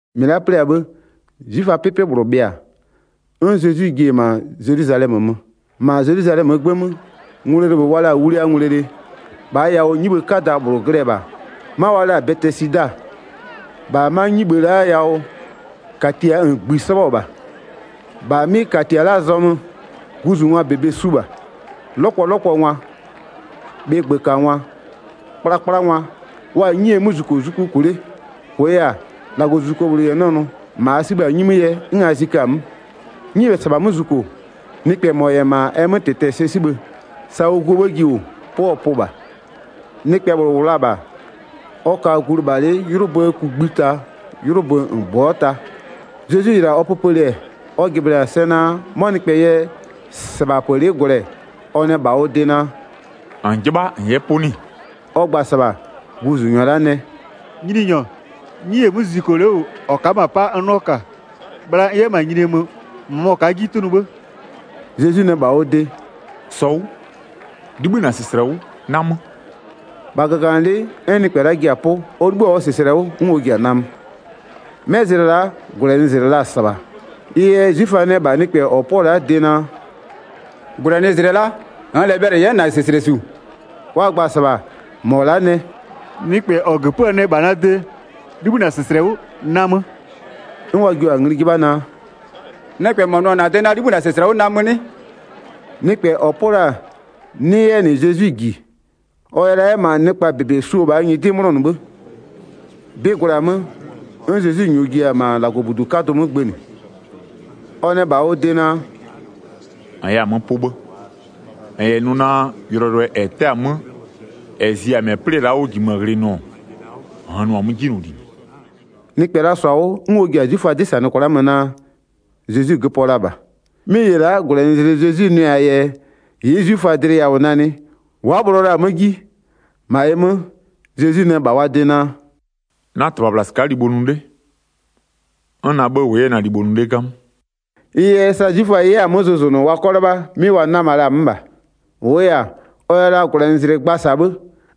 1-Mɩ la'a 'plɩ-a 'bhë-ë, 'zwiföaa 'pɩpɩ -bhlʋ bhɩa-a, 'n Zezwi ji-e -ma Zelwizalɛmö mö. 2-Ma Zelwizalɛmöö 'gbë 'mö ngwlele -bhlʋ wa la-a wliaa ngwlele, -bha a yawʋ 'nyibhë 'kada -bhlʋ glɩ-ɛ -bha, 'ma wa la-a Betɛsɩda. -Bha 'ma 'nyibhë la'a yawʋ -katia -ngbï 'sɩbhɔ-ɔ -bha. 3-Bha 'mɩ -katia la'aa zɔmö, guzungwaa -bebe su -bha. 'Lɔkpɔlɔkpɔngwa, bhɩgbökangwa, 'kplakplangwa, [wa-a 'nyie 'mözikozikʋ -kʋ 'le. 4-Wʋʋ yɛ-a, -Lagɔzuzuko -bhlʋ -yɛ nɛ nʋ, -ma a 'sibhë-a 'nyi 'mö yɛ 'n a zikɛ-a 'mö. 'Nyi -yɛ -sɩbha 'mö ziko, nɩkpɛ -mɔ -yɛ -ma -tɩtɛ-ɛ ɛ 'mö sɛ 'sibhë, sa ɔ guo 'bhë ji -wʋ, 'pʋ ɔ pʋ -bha.] 5Nɩkpɛ -bhlʋ -wʋ la-a -bha, ɔ ka gulɩbhalɩ'ɩ 'ylʋböö kugbïta 'ylʋbö -ngbɔta. 6Zezwi yɩlɩ-a ɔ pöpölɩ-ɛ, ɔ jɩblɩnɩ-a sɛ naa 'mɔ nɩkpɛ yɛ -sɩbhapölɩ'ɩ gwlɛ-ɛ, ɔ nɛ -bha ɔ de naa: “-N 'jɩbha -n 'yɛ 'pʋ 'nɩ-ɩ?” 7Ɔ gba-a -sɩbha, guzunyɔ la'a nɛ: “Nyininyɔ, 'nyi -yɛ 'mö ziko 'le -wʋ, -ɔ ka'a -ma ɛ 'mö 'pa n 'nɩɔ -ka. Bhla n 'yɛ -ma nyinie mö, -mʋmɔ-ɔ ka'a 'ji 'tʋnʋ 'bhë.” 8Zezwi nɛ -bha ɔ de: “-Sɔ 'wʋ, 'libhï -na -sɩslɛ 'wʋ, namö!” 9-Bha -gaganɩlɩ'ɩ, 'n nɩkpɛ la'a ji-a 'pʋ, ɔ 'libhï-a ɔ -sɩslɛ 'wʋ 'n ɔ ji-a namö. 'Mɛ zlɩ la'a -gwlɛnɩzlɩ la-a -sɩbha. 10Ɩ yɛ 'zwiföa nɛ -bha nɩkpɛ -ɔ 'pʋ-ɔ la'aa de naa: “-Gwlɛnɩzlɩ-ɛ la'a, -nn -lɛ bhɛlɩ -n 'yɛ -na -sɩslɛ -su.” 11Wa gba-a -sɩbha, -mɔ la'a nɛ: “Nɩkpɛ -ɔ -göpö'ö-a nɛ -bha na de: 'Libhï -na -sɩslɛ 'wʋ, namö.” 12'N wa jio-a ngli 'jɩbha naa: “Nɩkpɛɛ -mɔ nʋ-ɔ -na de naa 'libhï -na -sɩslɛ 'wʋ, namö 'nɩ?” 13Nɩkpɛ -ɔ 'pʋ la-a 'nɩ 'yɛ -nɩ Zezwi -ji, ɔ yɛ la 'yɛ -ma nɩkpa -bebe su-o -bhaa nyɩdɩ 'mʋnɔnʋ 'bhë. 14'Bɩ gwlɛ-a 'mö, 'n Zezwi -nyɔɔ ji-e -ma -Lagɔbudu 'kadʋ 'mö gbënɩ. Ɔ nɛ -bha 'mɔ nɩkpɛɛ de naa: “-N yɛ-a 'mö 'pʋ 'bhë, -n -yɛ nʋ naa yʋlɔyʋlʋɛ -ɛ 'tɛ-a 'mö -ɛ zi-a -mɛ 'plɩ-ɛ la'a -jimö-ö ghlɩ nʋ-ɔ, -nn nʋ-a 'mö 'jinyloli -nɩ.” 15Nɩkpɛ la'a -sɔ-a 'wʋ, 'n ɔ ji-a 'zwiföa 'dɩ -sanɩ kwla'a mö naa, Zezwi göpöɔ la -bha. 16'Mɩ -ɩ la'a -gwlɛnɩzlɩ Zezwi nʋɩ-aa yɛ, ɩ'ɩ 'zwiföa dlɩ yawʋ nanɩ, wa'a bhlɩɔ la-a 'mö 'ji. 17-Ma ɩ 'mö, Zezwi nɛ -bha wa de naa: “Na -Tɩbha-a -bhla -sɩka'a libho -nʋ 'le, 'n na 'bhë -wʋ 'yɛ na-a libho nʋ 'le 'gamö.” 18Ɩ yɛ, sa 'zwiföa 'yɛ-a 'mö zʋzʋnʋ wa 'kɔ 'lɩbha, 'mɩ wa 'nama la-a 'mö -bha. -Wʋʋ yɛ-a, ɔ yɛ la -gwlɛnɩzlɩ gba -sa 'bhë,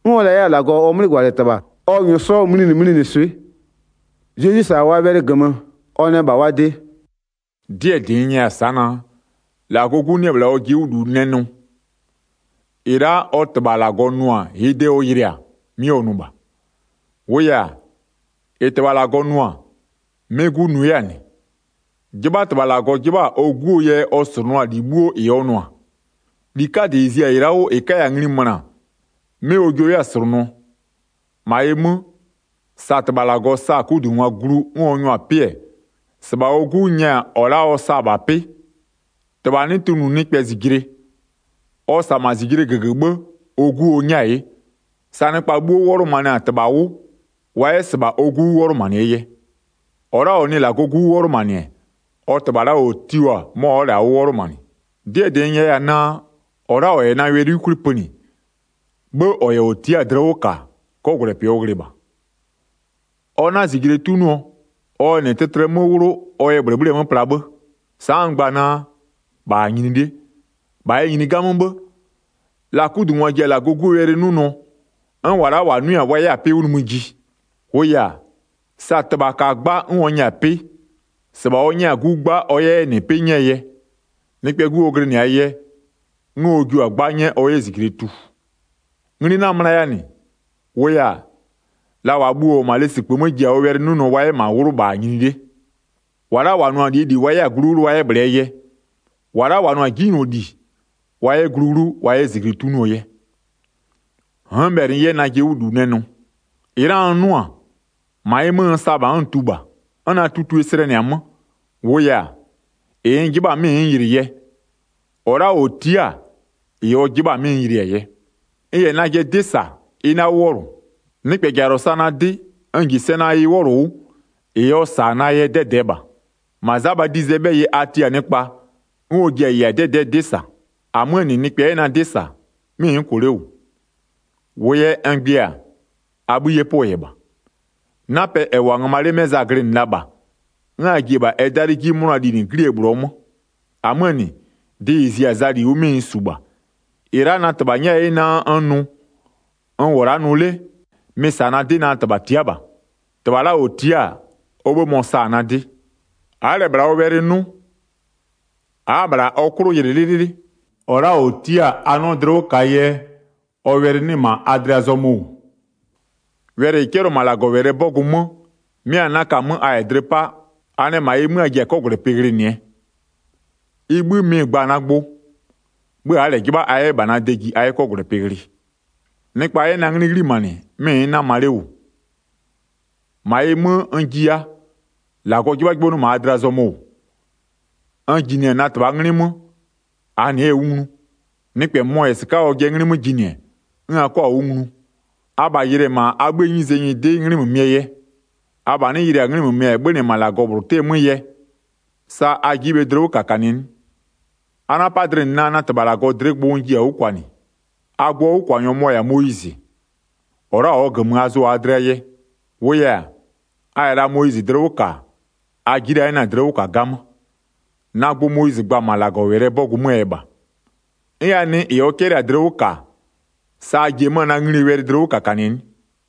'n ɔ la 'yɛ-a -Lagɔ ɔ 'mlɩgwalɩtɩbha, ɔ -nyʋʋ 'sɔɔ mlinɩmlinɩswɩ'ɩ. Zezwi yɛ ɔ -gömöö 'gbaa gbʋ gba 19Zezwi -sa-a wa wɛlɩ -gömö, ɔ nɛ -bha wa de: “'Dɩɛ -dɩ n nyɛya-a sa'a naa: -Lagɔɔ 'Gu 'nɩ-ɛ -bhla ɔjɩ 'wʋ -lu nɛ nʋ, -ɩ la'a ɔ -Tɩbha -Lagɔ nʋ-a -ɩɩ de ɔ yɩlɩ-a, 'mɩ ɔ nʋ -bha. -Wʋʋ yɛ-a, -ɩ -Tɩbha -Lagɔ nʋ-a, 'mɩ ɔ 'Gu nʋ 'yɛ-a -nɩ. 20'Jɩbha -Tɩbha 'jɩbha-a ɔ 'Guo yɛ ɔ -slʋnʋɔ-a -li 'bhuo -ɩ ɔ nʋ-a. -Li 'kadɩ -ɩ zi-a -mɩ la'a 'wʋ -ɩ 'kaya-a ngli möna 'mɩ ɔ jio 'yɛ-a -slʋnʋɔ. 21-Ma ɩ 'mö, sa -Tɩbha -Lagɔ sa-a 'kudungwa glu, 'n ɔ nyʋa-a 'pɩ-ɛ, -sɩbha ɔ 'Gu nyɛ-a -ɔ la'a -ɔ ɔ sa-a -bha 'pɩ. 22-Tɩbha 'nɩ tunʋ nɩkpɛ -zijle. Ɔ -sa-a -ma -zijlee -gëgëbhë, ɔ 'Gu ɔ 'nyɛ-a 'ye, 23sa nɩkpa 'bhuo 'wɔlʋmanɩ-a -Tɩbha 'wʋ wa 'yɛ -sɩbha ɔ 'Gu 'wʋ 'wɔlʋmanɩɛ yɛ. -Ɔ la'a -ɔ nɩ -Lagɔɔ 'Gu 'wʋ 'wɔlʋmanɩ-ɛ, ɔ -Tɩbha la'a -ɔ tio-a 'mɔ ɔ'ɔ -lɛ-a 'wʋ 'wɔlʋmanɩ. 24'Dɩɛ -dɩ n nyɛya-a naa: -Ɔ la'a -ɔ -yɛ na wɛlɩ 'yukwli pönɩ, 'bhë -ɔ -yɛ -ɔ tia'a-a dlɩ 'wʋ -ka, 'kɔgwlɛpɩ ɔ ghlɩ -bha, ɔ 'na -zijle 'tunʋɔ, ɔ yɛ -nɩ tlɩtlɩɛ 'mö 'wlʋ ɔ yɛ -bhlɩbhlɩɛ 'mö pla 'bhë. 25Sa'a n gba-a naa, -bha-a nyini 'le, -bha yɛ nyini 'gamö 'bhë, la 'kudungwa ji-a -Lagɔɔ 'Guo wɛlɩ 'nʋnʋɔ, 'n -wa la'a -wa 'nʋɩ-a, wa 'yɛ-a 'pɩ 'wʋ nimï ji. 26-Wʋʋ yɛ-a, sa -Tɩbha ka-a 'gba 'n ɔ nyɛ-a 'pɩ, -sɩbha ɔ 'nyɛ-a 'Gu 'gba ɔ 'yɛ 'pɩ 'nyɛɛ yɛ. 27Nɩkpɛɛ 'Gu ɔ glɩnɩ-aa yɛ, 'n ɔ jio-a 'gba 'nyɛ ɔ 'yɛ -zijle tu. 28Ngli 'na-a mönaya -nɩ, -wʋʋ yɛ-a, la -wa bhuo -wʋ-ɔ -ma lesikpï 'mö ji-a ɔ wɛlɩ 'nʋnʋɔ wa 'yɛ -ma 'wlʋ -bha-a nyini 'le. 29-Wa la'a -wa nʋ-a -lie -li wa 'yɛ-a glu 'wlʋ wa 'yɛ -bhlɩɛ yɛ, -wa la'a -wa nʋ-a 'jinyloli, wa 'yɛ-a glu 'wlʋ wa 'yɛ -zijle 'tunʋɔ yɛ. -Ɩ tulua Zezwie 'gba 30N'n bhɛlɩ n 'yɛ najɩ 'wʋ lu nɛ nʋ. -Ɩ la'a n 'nʋ-a, -ma ɩ 'mö n sa -bha 'n n tu -bha, 'n na tutue slɛnɩ 'yɛ-a 'mö, -wʋʋ yɛ-a, -ɩ n 'jɩbha-a 'mɩ n'n yɩlɩ yɛ, -ɔ la'a -ɔ tia'a-a, -ɩ ɔ 'jɩbha-a 'mɩ n yɩlɩ-a yɛ. 31N -yɛ najɩɛ 'dɩ -sa, ɩ 'na 'wʋ 'wɔlʋ. 32Nɩkpɛ -jalɔ -sa-a na 'dɩ, n -ji sɛ naa ɩ 'wɔlʋ 'wʋ, -ɩ ɔ -sa-a na yɛ 'dɛdɛɛ -bha. 33-Ma Za Badizɩɛ 'bhɛyɩ a tia-a -ma nɩkpa, 'n ɔ ji-a -ɩ -yɛ-a 'dɛdɛ'ɛɛ 'dɩ -sa. 34-Amöö -nɩ nɩkpɛ 'yɛ na 'dɩ -sa, 'mɩ n'n -kʋ 'le -wʋ, -wʋʋ yɛ n gbɩ-a, a 'bhï 'yɛ 'pʋɔ yɛ -bha. 35'Napɛ -ɛ -wʋ-a ngöma 'le 'mɛ Za glɩnɩ la -bha. 'N a ji-e -bha ɛ 'dalɩ 'ji 'mʋna linɩ 'glie -bhlʋɔ 'mö. 36-Amöö -nɩ, dɩ -ɩ zi-a -ɩ Za -sa 'wʋ 'mɩ n -su -bha. -Ɩ la'a na -Tɩbha nyɛ'ɛ-a 'ye naa n nʋ, n -wʋ-ɔ la'a nʋ 'le, mɩ-ɩ -sa-a na 'dɩ naa -Tɩbha tia'a -bha. 37-Tɩbha la'a -ɔ tia'a-a, ɔ 'bhë mɔ-ɔ sa-a na 'dɩ. A'a -lɛ -bhla ɔ wɛlɩ 'nʋ, a'a-a -bhla ɔ 'klʋ yɩlɩ 'lɩlɩlɩ. 38-Ɔ la'a -ɔ tia'a-a a 'nɩɔ dlɩ 'wʋ -kaa yɛ, ɔ wɛlɩ 'nɩ -ma a dlɩa zɔmö -wʋ. 39Wɛlɩ -ɩ 'cɛlɩɔ-ɔ -ma -Lagɔwɛlɩɛ 'bɔgʋ 'mö, 'mɩ a 'naka-a 'mö a -yɛ dlɩ 'pa, a nɛ -ma ɩ 'mö a ji-a 'kɔgwlɛpɩ ghlɩnɩɛ, ɩ 'bhï mɩ-ɩ gba-a na gbʋ, 40'bhë a'a -lɛ 'jɩbha a 'yɛ -bha na de ji a 'yɛ 'pɩ ghlɩ. 41Nɩkpa 'yɛ na 'nglɩ 'ghlimanɩ, 'mɩ n'n 'nama 'le -wʋ. 42-Ma ɩ 'mö, n jiya, -Lagɔɔ 'jɩbhajɩbhʋ 'nɩ -ma a dlɩa zɔmö -wʋ. 43N jinɩ-ɛ na -Tɩbhaa 'nglɩ 'mö, a nɩ'ɩ-ɛ 'wʋ nglu, nɩkpɛ -mʋmɔ -yɛ -nɩ -sɩka'a ɔjɩɛ 'nglɩ 'mö jinɩ, 'n a 'kɔ-a 'wʋ nglu. 44Abha yɩlɩ-ɛ -ma a 'bhïë 'nyizee nyɩdɩ 'nglɩmömɩɛ yɛ, abha 'nɩ yɩlɩ-a 'nglɩmömɩɛ -ɛ 'bhönɩ-ɛ -ma -Lagɔ -bhlʋ 'tɩɛ 'mö yɛ, sa a ji'i bhe dlɩ 'wʋ -kakanɩɛ 'nɩ? 45A 'na-a 'pa dlɩ -nɩ naa -ma na -Tɩbha -Lagɔ dlɩ'ɩ gbʋ n jiya-a 'wʋ kwa -nɩ. A gbʋɔ 'wʋkwanyɔ mɔ-ɔ -yɛ-a Moyizɩ, -ɔ la'a -ɔɔ -gömö a zʋ-a a dlɩa yɛ. 46-Wʋʋ yɛ-a, a -yɛ la Moyizɩ dlɩ 'wʋ -ka, a ji'i la 'yɛ na-a dlɩ 'wʋ -ka 'gamö. Na gbʋ Moyizɩ gba-a -ma -Lagɔwɛlɩɛ 'bɔgʋ 'möö yɛ -bha. 47'N a nɩ -ɩ ɔ 'cɛlɩ-a dlɩ 'wʋ -ka, sa a ji-e 'mö-a na nglie wɛlɩ dlɩ 'wʋ -kakanɩɛ 'nɩ?”